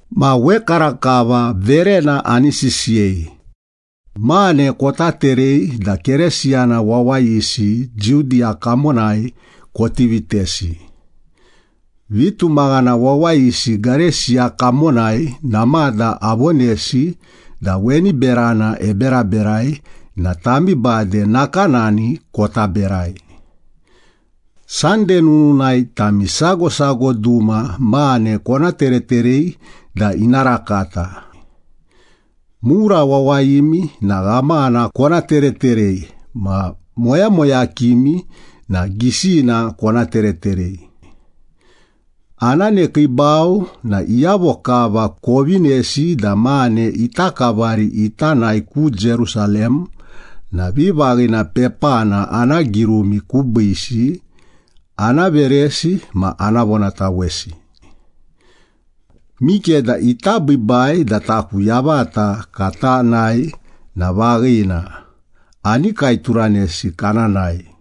Ma wekarakava verena ani sisiyei. Mane kota terei da Keresiyana wawayisi Judiya kamonai koti vitesi. Vitumaghana wawayisi Gareisiya kamonai namada avonesi da weni berana eberaberai na tami bade nakanani kota berai. Sande nununai tami sago sago duma mane kona tereterei da ina rakata. Mura wawayimi na ghamana kona tereterei ma moyamoyakimi na gisina kona tereterei. Ana nekiibau na iyavo kava kovinesi da mane ita kavari ita nae ku Jerusalem na vivaghina pepana ana girumi kubiisi, ana veresi ma ana vonatawesi. Mikeda ita biibai da taku yavata kata nae na vaghina, ani kaeturanesi kana nae.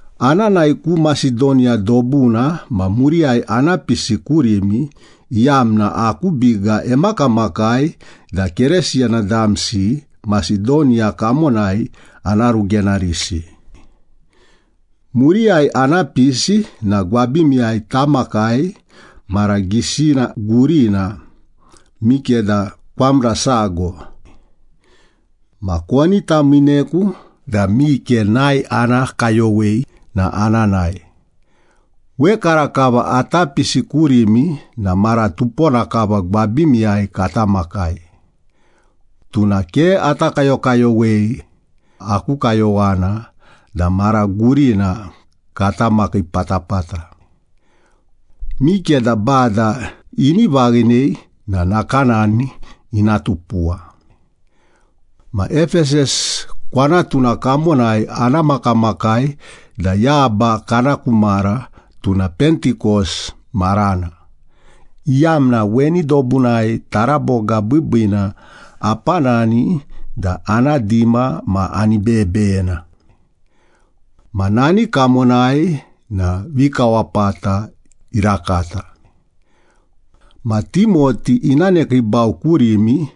Ana nae ku Masedoniya dobuna ma muriyai ana pisi kurimi, iyamna aku biga emakamakai da Keresiyana damsi Masedoniya kamonai ana rugenarisi. Muriyai ana pisi na gwabimiyai tamakai mara gisina gurina, mikeda kwamra sago. Ma koni tamiineku da mike nae ana kayowei boni na ana nae. Wekarakava ata pisi kurimi na mara tupona kava gwabimiyai kata makai. Tuna ke ata kayokayowei, aku kayowana da mara gurina katamakii patapata. Mikeda Bada ini vaghinei na nakanani ina tupuwa. Ma Epesas kwanatuna kamonai ana makamakai da yaba kana ku mara, tuna Pentikos marana, iyamna weni dobunai taraboga biibiina apanani da ana dima ma ani beyebeyena. Ma nani kamonai na vikawapata irakata. Ma Timoti ina nekiibau kurimi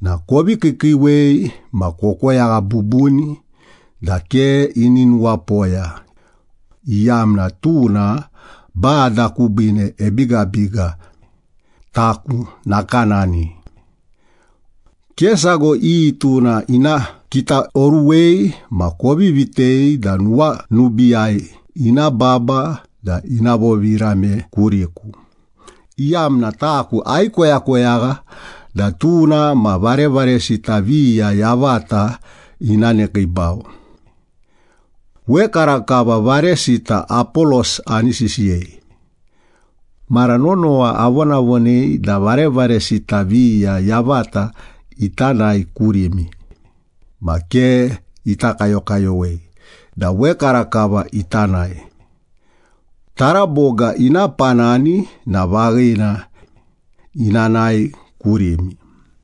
na kovi kiikiiwei ma kokoyagha bubuni da ke ini nuwapoya, iyamna tuna Bada kubiine ebigabiga, taku nakanani. Ke sago iyi tuna ina kitaoruwei ma kovi vitei da nuwanubiiyai ina baba da ina vovirame kuriku, iyamna taku aikoyakoyagha da tuna ma varevaresita viya yavata ina nekiibau. Wekarakava varesita Apolos ani sisiyei. Mara nonowa avonavonei da varevaresita viya yavata ita nae kurimi, ma ke ita kayokayowei da wekarakava ita nae. Taraboga ina panani na vaghina, ina nae kurimi.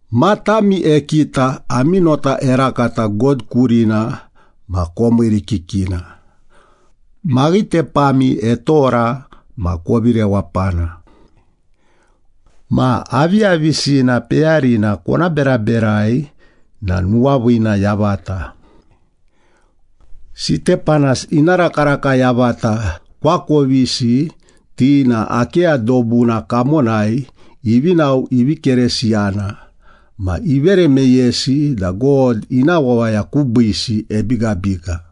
Matami ekita, ami nota erakata God kurina ma komiirikikina, maghitepami etora ma kovi rewapana. Ma aviyavisina peyarina kona beraberai na nuwaviina yavata. Sitepanas ina rakaraka yavata koakovisi, ti na Akeya dobuna kamonai ivi nao ivi Keresiyana, ma ivere meyesi da God ina wawaya kubiisi ebigabiga.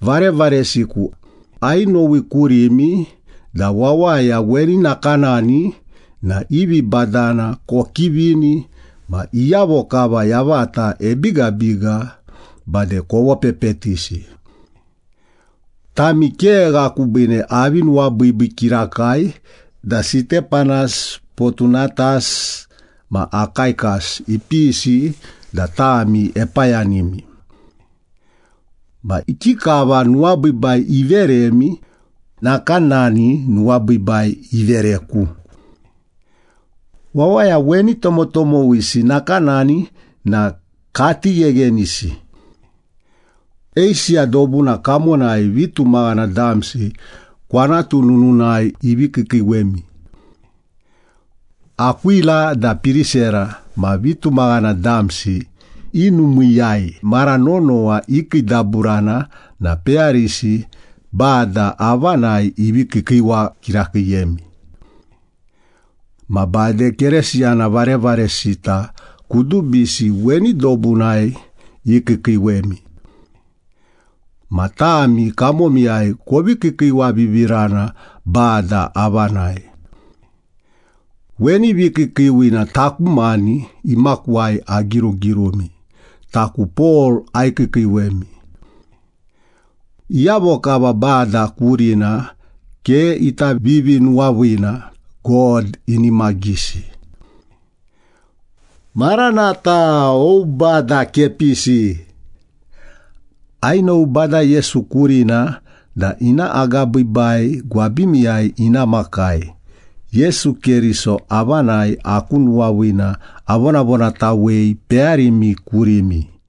Varevaresiku, ainowi kurimi da wawaya weni nakanani na i vibadana kokivini ma iyavo kava yavata ebigabiga bade kovopepetisi. Tami kegha kubiine avi nuwabiibii kirakai da Sitepanas, Potunatas ma Akaikas ipisi da tami epayanimi. Ma ikikava nuwabiibai iveremi, nakanani nuwabiibai ivereku. Wawaya weni tomotomowisi nakanani na kati gheghenisi. Eisiya dobuna kamonai vitumaghana damsi kwanatu nununai ivi kiikiiwemi. Akwila da Pirisera ma vitumaghana damsi i numiiyai mara nonowa ikiidaburana na peyarisi Bada avanai, ivi kiikiiwa kirakiiyemi. Ma bade Keresiyana varevaresita kudubisi weni dobunai ikiikiiwemi. Ma tami kamomiyai kovi kiikiiwavivirana Bada avanai. Weni vikiikiiwina taku mani imakuwai agirugirumi, “Taku Pol, aikiikiiwemi.” Iyavo kava Bada kurina ke ita vivinuwaviina, God inimagisi. Maranatha! O, Bada kepisi! Ainowi Bada Yesu kurina da ina agabiibai gwabimiyai ina makai. Yesu Keriso avanai aku nuwaviina avonavonatawei peyarimi kurimi.